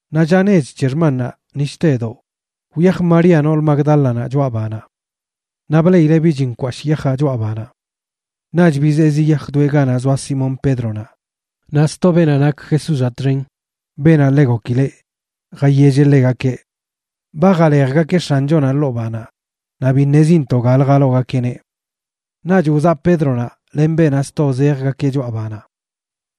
Naꞌ lla nech c̱he xmannaꞌ, ni shtedoꞌ, wyaj María nool Magdálanaꞌ choꞌa banaꞌ. Naꞌ bleꞌileꞌ bich nkwashꞌ yajaꞌ choꞌa banaꞌ. Naꞌch bizee ziyajdoeꞌ ganaꞌ zoa Simón Pédronaꞌ naꞌ sto beenaꞌ nak Jesúzaꞌ txen, beenaꞌ ḻe gokileꞌ, jayelleꞌ ḻegakeꞌ: ―Ba jalejgakeꞌ X̱anchonaꞌ ḻoo banaꞌ naꞌ bi ṉezintoꞌ galə jaloogakeꞌneꞌ. Naꞌch wzaꞌ Pédronaꞌ len beenaꞌ sto zejgakeꞌ choꞌa banaꞌ.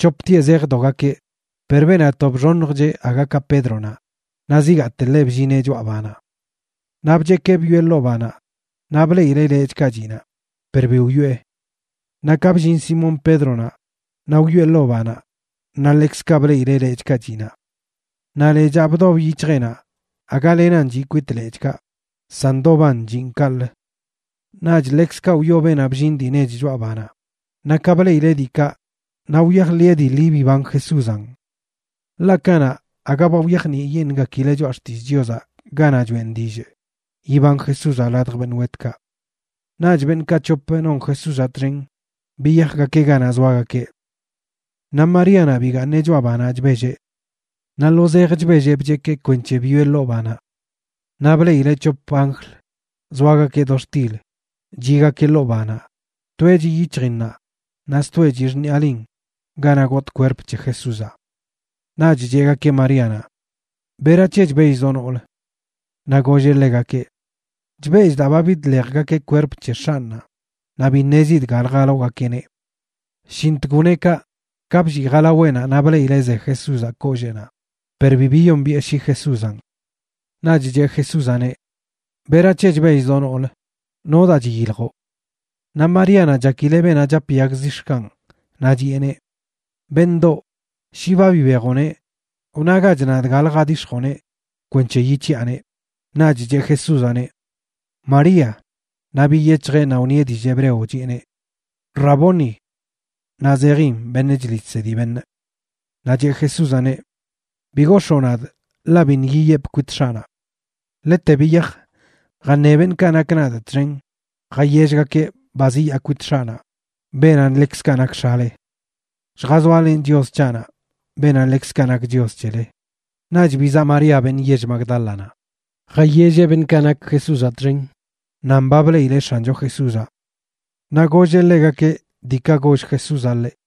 C̱hoptieꞌ zejdogakeꞌ, per beenaꞌ to bxoṉjcheꞌ aga ka Pédronaꞌ naꞌ zigaate ḻeꞌ bllineꞌ choꞌa banaꞌ. Naꞌ bchekee bwieꞌ ḻoo banaꞌ naꞌ bleꞌileꞌ lechꞌkaꞌ chiꞌ naꞌ, per bi wyoꞌe. Naꞌ ka bllin Simón Pédronaꞌ naꞌ wyoꞌe ḻoo banaꞌ naꞌ ḻekzkaꞌ bleꞌileꞌ lechꞌkaꞌ chiꞌ naꞌ. Naꞌ lechaꞌ bdob yic̱hjeꞌnaꞌ aga lenan chiꞌ kwit lechꞌkaꞌ, san ndoban chiꞌn kaꞌlə. Naꞌch ḻekzkaꞌ wyoo beenaꞌ bllin dii nech choꞌa banaꞌ, naꞌ ka bleꞌileꞌ diikaꞌ naꞌ wyajḻiꞌe dii ḻi biban Jesúzanꞌ. Ḻaꞌ kanaꞌ aga ba wyajniꞌyeṉꞌgakileꞌ Choꞌa Xtillꞌ Chiozaꞌ ganaꞌ choꞌen dillꞌ yiban Jesúzaꞌ ladj beṉꞌ wetkaꞌ. Naꞌch beṉꞌkaꞌ c̱hop non Jesúzaꞌ txen biyajgakeꞌ ganaꞌ zoagakeꞌ. Naꞌ Maríanaꞌ bigaaṉeꞌ choꞌa banaꞌ chbelleꞌ. Naꞌ lo zej chbelleꞌ bchekee kwenc̱he bwieꞌ ḻoo banaꞌ. Naꞌ bleꞌileꞌ c̱hop anjl zoagakeꞌ do xtil, chiꞌgakeꞌ ḻoo banaꞌ, toeꞌ chiꞌ yic̱hjinnaꞌ naꞌ stoeꞌ chiꞌ xṉiꞌalin ganaꞌ gotꞌ kwerp c̱he Jesúzaꞌ. Naꞌch cheꞌgakeꞌ Maríanaꞌ: ―¿Berac̱he chbellzoꞌ, noolə? Naꞌ golleꞌ ḻegakeꞌ: ―Chbellꞌ daa ba bidḻejgakeꞌ kwerp c̱he X̱anꞌnaꞌ, naꞌ bi ṉezidꞌ galə jaloogakeꞌneꞌ. Shintg wneꞌ kaꞌ, ka bllii jalaweꞌnaꞌ naꞌ bleꞌileꞌ ze Jesúzaꞌ kolleenaꞌ, per bi biyombiꞌe shi Jesúzanꞌ. Naꞌch cheꞌ Jesúzaꞌneꞌ: ―¿Berac̱he chbellzoꞌ, noolə? ¿Nodaa chiyiljoꞌ? Naꞌ Maríanaꞌ chakileꞌ beenaꞌ chap yag zix̱kanꞌ, naꞌ chiꞌeneꞌ: ―Beṉꞌdoꞌ, shi ba bibejoꞌneꞌ, wnagach nadꞌ galə jadix̱joꞌneꞌ kwenc̱he yic̱hiꞌaneꞌ. Naꞌch cheꞌ Jesúzaꞌneꞌ: ―¡María! Naꞌ biyec̱hjeꞌ naꞌ wṉieꞌneꞌ dillꞌ hebreo, chiꞌeneꞌ: ―¡Raboni! ―naꞌ zejin: beṉꞌ chliꞌ chsedi beṉꞌ. Naꞌ cheꞌ Jesúzaꞌneꞌ: ―Bi gox̱oo nadꞌ, ḻaꞌ biṉꞌ yiyepꞌ kwit X̱aꞌnaꞌ. Ḻete biyaj, jaṉe beṉꞌkaꞌ nak nadꞌ txen jayellgakeꞌ ba ziyaa kwit X̱aꞌnaꞌ, beenaꞌ ḻekzkaꞌ nak X̱ale. Lljazoalenꞌ Chios c̱haꞌnaꞌ, beenaꞌ ḻekzkaꞌ nak Chios c̱hele. Naꞌch bizaꞌ María, beṉꞌ yell Magdálanaꞌ, jayelleꞌ beṉꞌkaꞌ nak Jesúzaꞌ txen nan ba bleꞌileꞌ X̱ancho Jesúzaꞌ. Naꞌ golleꞌ ḻegakeꞌ diikaꞌ goll Jesúzaꞌ ḻeꞌ.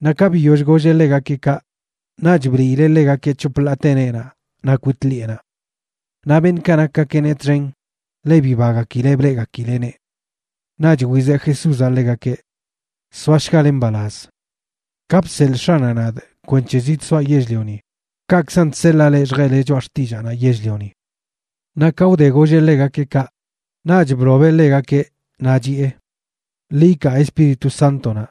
Naꞌ ka biyoll golleꞌ ḻegakeꞌ kaꞌ, naꞌch bliileꞌ ḻegakeꞌ c̱hop ḻaate neenaꞌ naꞌ kwit ḻiꞌenaꞌ. Naꞌ beṉꞌkaꞌ nakgakeꞌneꞌ txen ḻe bibagakileꞌ bleꞌgakileꞌneꞌ. Naꞌch wizeꞌ Jesúzaꞌ ḻegakeꞌ: ―Soashgale mbalaz. Ka bseḻꞌ X̱aꞌnaꞌ nadꞌ kwenc̱he zidsoaꞌ yell-lioni, kaꞌkzan chseḻaa leꞌ lljeꞌle choꞌa xtillaanaꞌ yell-lioni. Naꞌ ka wde golleꞌ ḻegakeꞌ kaꞌ, naꞌch blobeꞌ ḻegakeꞌ, naꞌ chiꞌe: ―Ḻi ikaa Espíritu Sántonaꞌ.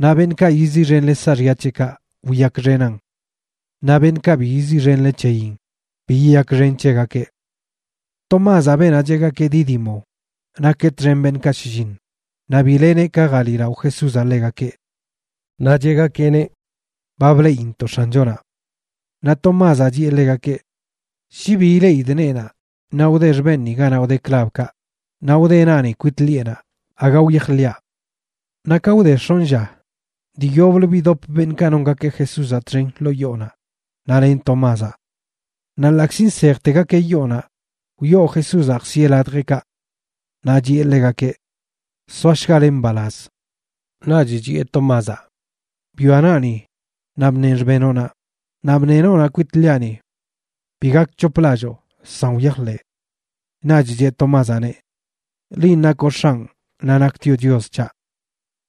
Naꞌ beṉꞌkaꞌ yiziꞌxenle saaxya c̱heꞌkaꞌ, wiyakxenan. Naꞌ beṉꞌkaꞌ bi yiziꞌxenle c̱heyin, bi yiyakxen c̱hegakeꞌ. Tomázaꞌ, beenaꞌ cheꞌgakeꞌ Dídimo nakeꞌ txen beṉꞌkaꞌ shlliṉ, naꞌ bi leneꞌ ka jaliꞌlao Jesúzaꞌ ḻegakeꞌ. Naꞌ cheꞌgakeꞌneꞌ: ―Ba bleꞌintoꞌ X̱anchonaꞌ. Naꞌ Tomázaꞌ chiꞌe ḻegakeꞌ: ―Shi bi ileꞌidꞌ neenaꞌ naꞌ wde xbenꞌni ganaꞌ wde klabkaꞌ, naꞌ wde naꞌni kwit ḻiꞌenaꞌ, aga wyajḻiꞌa. Naꞌ ka wde x̱onꞌ lla, dii yoblə bidop beṉꞌkaꞌ nongakeꞌ Jesúzaꞌ txen ḻoo yoonaꞌ naꞌ len Tomázaꞌ. Naꞌ ḻaꞌkzi nsejtegakeꞌ yoonaꞌ, wyoo Jesúzaꞌ jsieꞌ ladjeꞌkaꞌ. Naꞌ chiꞌe ḻegakeꞌ: ―Soashgale mbalaz. Naꞌch chiꞌe Tomázaꞌ: ―Bwia naꞌni, naꞌ bṉeꞌn xbenoꞌnaꞌ; naꞌ bṉeꞌ noonaꞌ kwit ḻiꞌani. Bi gakc̱hoplalloo, san wyajḻeꞌ. Naꞌch cheꞌ Tomázaꞌneꞌ: ―¡Linꞌ nakoꞌ X̱anꞌ naꞌ naktioꞌ Chios c̱haꞌ!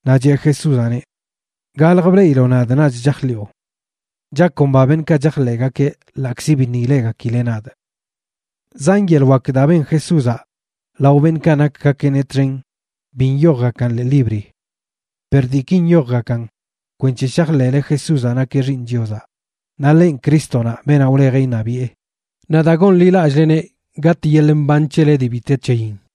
Naꞌ cheꞌ Jesúzaꞌneꞌ: ―Galj bleꞌiloꞌ nadꞌ naꞌch chajḻiꞌo. Chakomba beṉꞌkaꞌ chajḻeꞌgakeꞌ ḻaꞌkzi biṉꞌ ileꞌgakileꞌ nadꞌ. Zan yeḻꞌ wak daa ben Jesúzaꞌ lao beṉꞌkaꞌ nakgakeꞌneꞌ txen bi nyojgakan ḻee libri. Per diiki nyojgakan kwenc̱he shajḻeꞌle Jesúzaꞌ nakeꞌ Xiiṉ Chiozaꞌ naꞌ ḻenꞌ Crístonaꞌ, beenaꞌ wlejeꞌ iṉabiꞌe, naꞌ daa gonḻilallꞌleneꞌ gatꞌ yeḻꞌ mban c̱hele dii bi te c̱heyin.